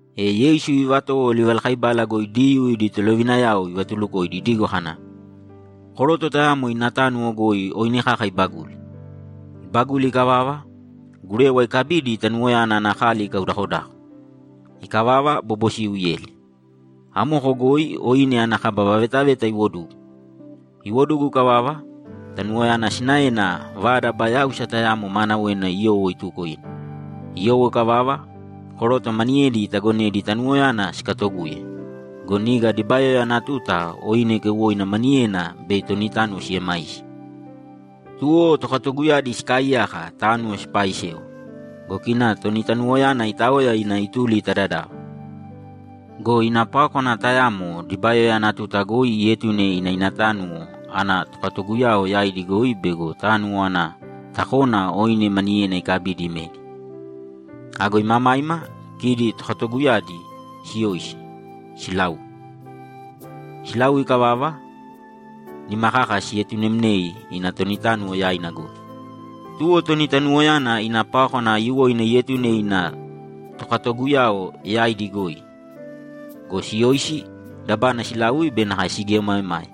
E Yeisu ivatowo livalakaibala goi Diyuu idi tolovinayao ivatulukoidi idigo kana, ‘Koroto tayamo ina tánuwo goi oine kaka ibaguli. Ibaguli ikavava, gurewa ikabidi tanuwoyana ana kali ikaudakodako. Ikavava, bobosiu ieli, amoko goi oine ana kaba vavetaveta iwodugu. Iwodugu ikavava, tanuwoyana sinaena vada aba yáusa tayamo maanawena iyowo ituko ina. Iyowo ikavava, koroto maniyedi itagonedi tanuwoyana sikatoguye go, niga dibayoya ana tuta oine keuwoina maniyena bei toni tánuwo siemaisi. Tuwo tokatoguyadi sikaaiyaka tánuwo sipaaisewa go, kina toni tanuwoyana itaoya ina ituli ta dadava. Go ina pákwana tayamo dibayoya ana tuta goi ietune ina ina tánuwo ana tokatoguyao yaidi goi bego tánuwo ana takona oine maniyena ikabidi imedi. Ago imamaima, kidi tokatoguyadi siyoisi, silaui. Silaui ikavava, nima kaka sietunemnei ina toni tánuwo yaina goi. Tuwo toni tanuwoyana ina pákwana aiyuwoina ietune ina tokatoguyao yaidi goi go, siyoisi, dabana silaui be nakae sigieomaemae.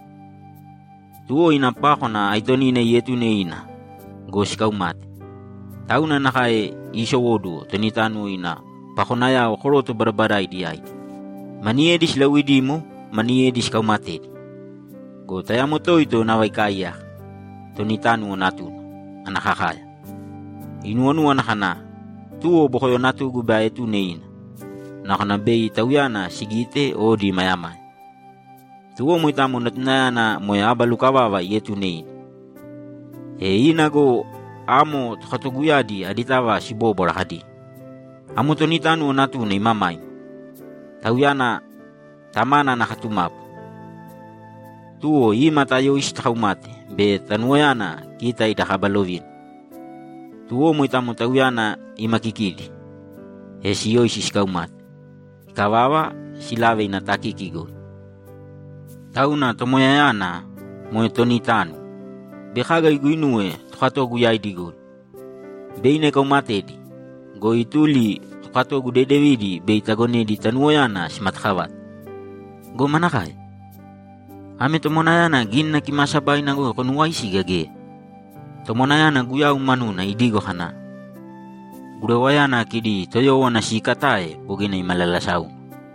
Tuwo ina pákwana aitonina ietune ina go, sikaumate. Tauna nakae iisowóduwo toni tánuwo ina pakonayao koroto badabadaidi yaidi; maniyedi silauidimo, maniyedi sikauumatedi. Go tayamo toito nava ikaaiyaka, toni tánuwo natuna, ana kakaya. Inuwonúwana kana, “Tuwo bokoyo natugu bei aetune ina. Nakona bei tauyana sigite odi imayamaya.” Tuwo moitamo natunayana moe aba lukavava ietune ina. E ina go, amo tokatoguyadi aditava sibóbwara kadi, “Amo toni tánuwo natuna imamaima. Tauyana tamana ana katumapu. Tuwo ima, tayōisi takaumāte bei tanuwoyana kita ida kaba lovina.” Tuwo moitamo tauyana ima kikidi, e siyoisi sikaumate. Ikavava, silave ina takiki goi. Tauna tomoyayana, moe toni tánuwo, bei kaga iguinuwe tokatogu yaidi goi? Bei ina ikaumatedi go, ituli ta tokatogu dedevidi bei itagonedi tanuwoyana simatakavate. Go manakae? Ame tomwanayana Gínina Kimaasabaina goi konuuwaisi gea geya? Tomwanayana Guyau manuna idigo kana, “Gurewayana kidi toyówana siikatae bogina imalalasáuna.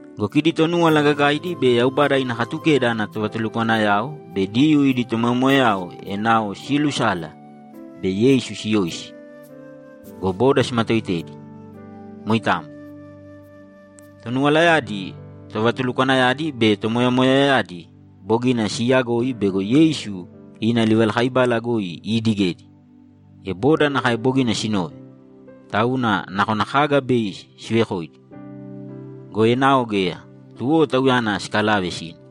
Go kidi Tonúwala Gagaidi be Yaubada ina Katukeda ana tovatulukwanayao be Diyuu idi tomoyamoyayao enao siilusala bei Yeisu siyoisi go, boda simatoitedi. Moitamo. Tonuwalayadi, tovatulukwanayadi be tomoyamoyayadi bogina siiyagoi bego Yeisu ina livalakaibala goi iidigedi, e boda nakae bogina sinove, tauna nakona kaga bei sivekoidi. Go enao geya, tuwo Tauyana sikalave sina.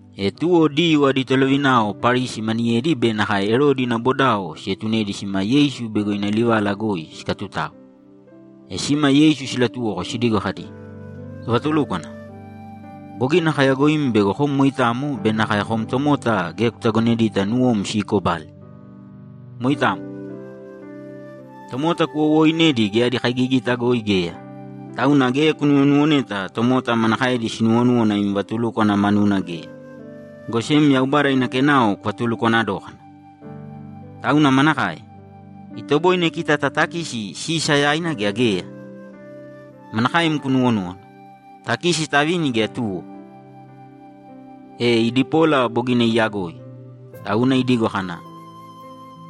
E tuwo Diyuu adi tolovinao Parisi maniyedi be nakae Erodi ina bodao sietunedi sima Yeisu bego ina livala goi sikatutao. E sima Yeisu silatuwoko sidigo kadi, ‘Tovatulúkwana, bogina kayagoim bego kom moitamo be nakae kom tomota geya kutagonedita nuwom siikobale. Moitamo. Tomota kuwowooinedi geya adi kaigigita goi geya, tauna geya kunuwonuwoneta tomota manakaedi sinuwonúwana im vatulúkwana manuna geya, go sem Yaubada ina kenao kuvatulukwana dókana. Tauna manakae? Itoboine kita tatakisi Sisa yaina gea geya? Manakaem kunuwonúwana, takisi tavini gea tuwo?’ E idi pola bogina iiyagoi, tauna idigo kana,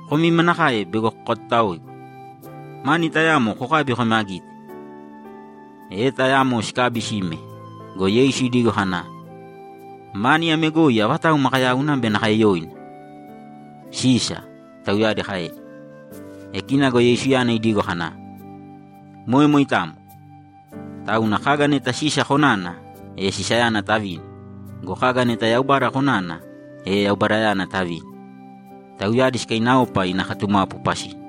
‘Komi manakae bego kokatutaoigu! Mani tayamo kokābi kōme agite.’ E tayamo sikabi sime go, Yeisu idigo kana, ‘Mani ame goi avatau makayauna be nakae yoina?’ ‘Sisa’, tauyadi kaedi. E kina go Yeisuyana idigo kana, ‘Moe moitamo. Tauna kaga neta Sisa konana, e Sisayana tavīni go, kaga neta Yaubada konana, e Yaubadayana tavīni.’ Tauyadi sikainaopa ina katumapu pasina.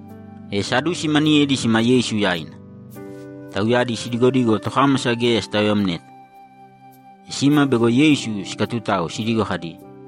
E Sadusi maniyedi sima Yeisu yaina. Tauyadi sidigodigo tokámasa geya sitaoyamneta. E sima bego Yeisu sikatutao sidigo kadi,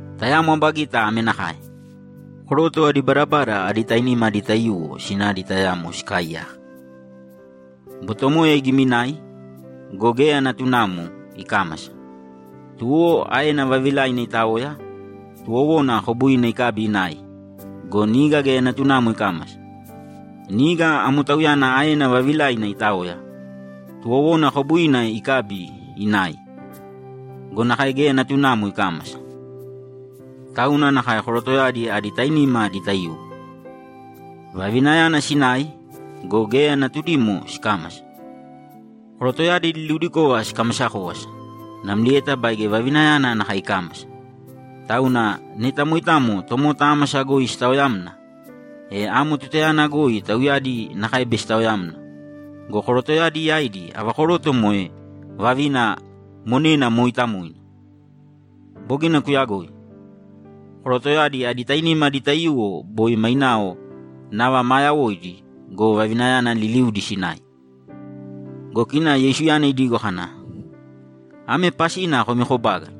Tayamo aba gita ame nakae: Koroto adi badabada adi tainima adi taiyuwo sinadi tayamo sikaaiyaka. Botomoya igiminai go, geya natunamo ikámasa. Tuwo aena vavilaina itaoya, tuwowona kobuina ikabi inai go, niga geya natunamo ikámasa. Niga amo tauyana aena vavilaina itaoya, tuwowona kobuina ikabi inai go, nakae geya natunamo ikámasa. Tauna nakae korotoyadi adi tainima adi taiyuwo. Vavinayana sinai go, geya natudimo sikámasa. Korotoyadi liliudikova sikamasa kówasa, namlieta baige vavinayana nakae ikámasa. Tauna neta moitamo tomota ámasa goi sitaoyamna, e amo tutayana goi tauyadi nakae bei sitaoyamna go, korotoyadi yaidi ava koroto moe vavina monena mooitamoina? Bogina kuyagoi. Korotoyadi adi tainima adi taiyuwo boi mainao nava maa yawoidi go, vavinayana liliudi sinai.’ Go kina Yeisuyana idigo kana, ‘Ame pasina komi kobágala: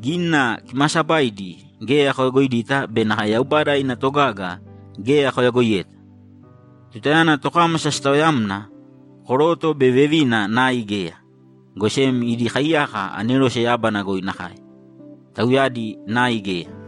Gínina Kimaasabaidi geya koyagoidita be nakae Yaubada ina togaga geya koyagoiyeta! Tutayana tokámasa sitaoyamna, koroto be vevina nai geya, go sem idi kaiyaka anerose yábana goi nakae; tauyadi nai geya.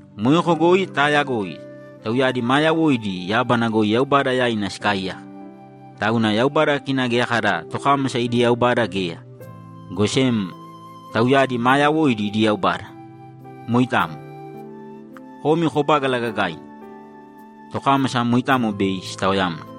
Moeko goi taayagoi tauyadi maa yawoidi yábana goi Yaubada yaina sikaaiyaka. Tauna Yaubada kina geya kada tokámasa idi Yaubada geya, go sem tauyadi maa yawoidi idi Yaubada. Moitamo. Komi kobágala gagaina. Tokámasa moitamo bei sitaoyamna.’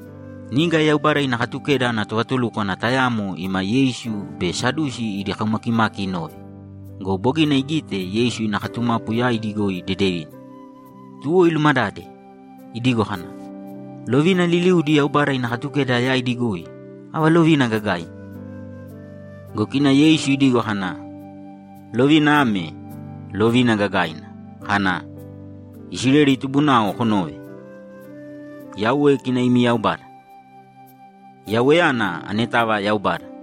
Niga Yaubada ina Katukeda ana tovatulúkwana tayamo ima Yeisu be Sadusi idi kaumakimaki inove go, bogina igite Yeisu ina katumapu yaidi goi dedevina. Tuwo ilumadade idigo kana, ‘Lovina liliudi Yaubada ina Katukeda yaidi goi, ava lovina gagaina?’ Go kina Yeisu idigo kana, ‘Lovina ame, lovina gagaina kana, “Isileli tubunao konōve. Yauwe kina imi Yaubada; Yauweyana anetava Yaubada.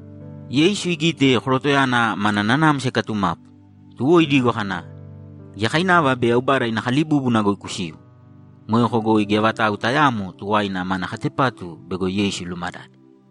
Yeisu igite korotoyana mana nanamsa ikatumapu, tuwo idigo kana, ‘Giyakainava bei Yaubada ina kalibúbuna goi kusiu.’ Moeko goi geya vatau tayaamo tuwaina mana katepatu bego Yeisu ilumadade.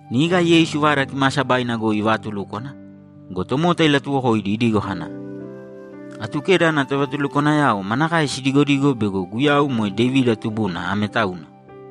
Niga Yeisu Vada Kimaasabaina goi ivaatulúkwana go, tomota ilatuwokoidi idigo kana, ‘Atukeda ana tovatulukwanayao manakae sidigodigo bego Guyau moe Devida tubuna ame tauna?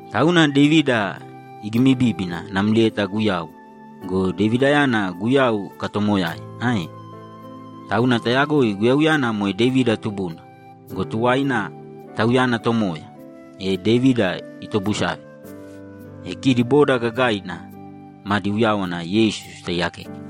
Tauna Devida igimibíbina namlieta Guyau go, Devidayana Guyau ikatoomoyae, ae? Tauna tayagoi Guyauyana moe Devida tubuna go, tuwaina, Tauyana Tomoya, e Devida itobusave!’ E kidi boda gagaina madi uyáwana Yeisu sitaiyakeke.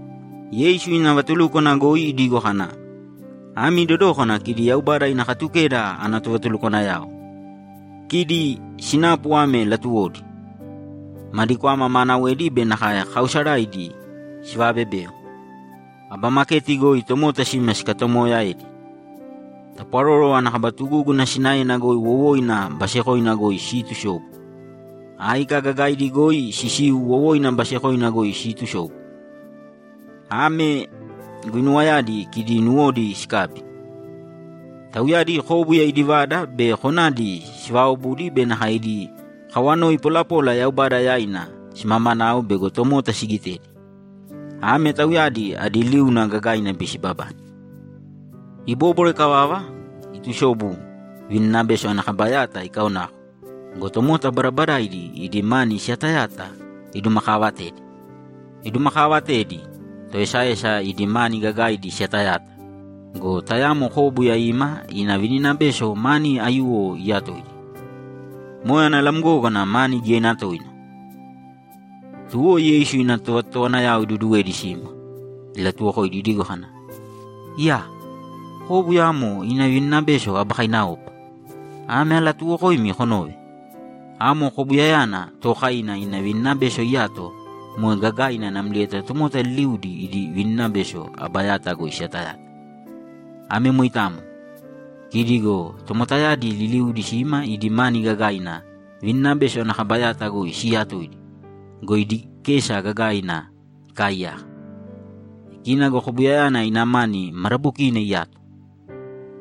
Yeisu ina vatulúkwana goi idigo kana, ‘Ami dodōkana kidi Yaubada ina Katukeda ana tovatulukwanayao. Kidi sinapu ame latuwodi: Madi kwama maanawedi be nakae kaausaraidi sivaabebeo. Aba maketi goi tomota sima sikatoomoyaedi. Tapwaroro ana kaba tugúguna sinaena wowoina basekoina goi siitusobu. Áika gagaidi goi sisiu wowoina basekoina goi siitusobu. Ame guinuwayadi kidi nuwodi sikabi. Tauyadi kóbuya idi vada be konadi sivaaobudi be nakae idi kawanoi polapola Yaubada yaina simamanao bego tomota sigitedi. Ame tauyadi adi liuna gagaina bei sibabane.’ Ibóbwara ikavava, itusobu, vininabeso ana kaba yata ikaonako go, tomota badabadaidi idi mani siyatayata idumakaavatedi. Idumakaavatedi, toesaesa idi mani gagaidi siyatayata go, tayamo kóbuya ima ina vininabeso mani aiyuwo iyatoidi, moe ana lamgógana mani giyaina toina. Tuwo Yeisu ina tovatotowanayao iduduwedi sima, ilatuwokoidi idigo kana, ‘Iyaa! Kóbuya amo ina vininabeso aba kainaopa! Ame alatuuwokoimi konōve: Amo kobuyayana tookaina ina vininabeso iyato moe gagaina namlieta tomota liliudi idi vininabeso aba yata goi siyatayata. Ame moitamo. Kidi go tomotayadi liliudi sima idi mani gagaina vininabeso ana kaba yata goi siiyatoidi go, idi kesa gagaina ikaaiyaka. E kina go kobuyayana ina mani madabokiina iyato.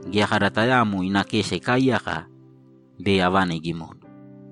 Geya kada tayaamo ina kesa ikaaiyaka bei avana igimona.’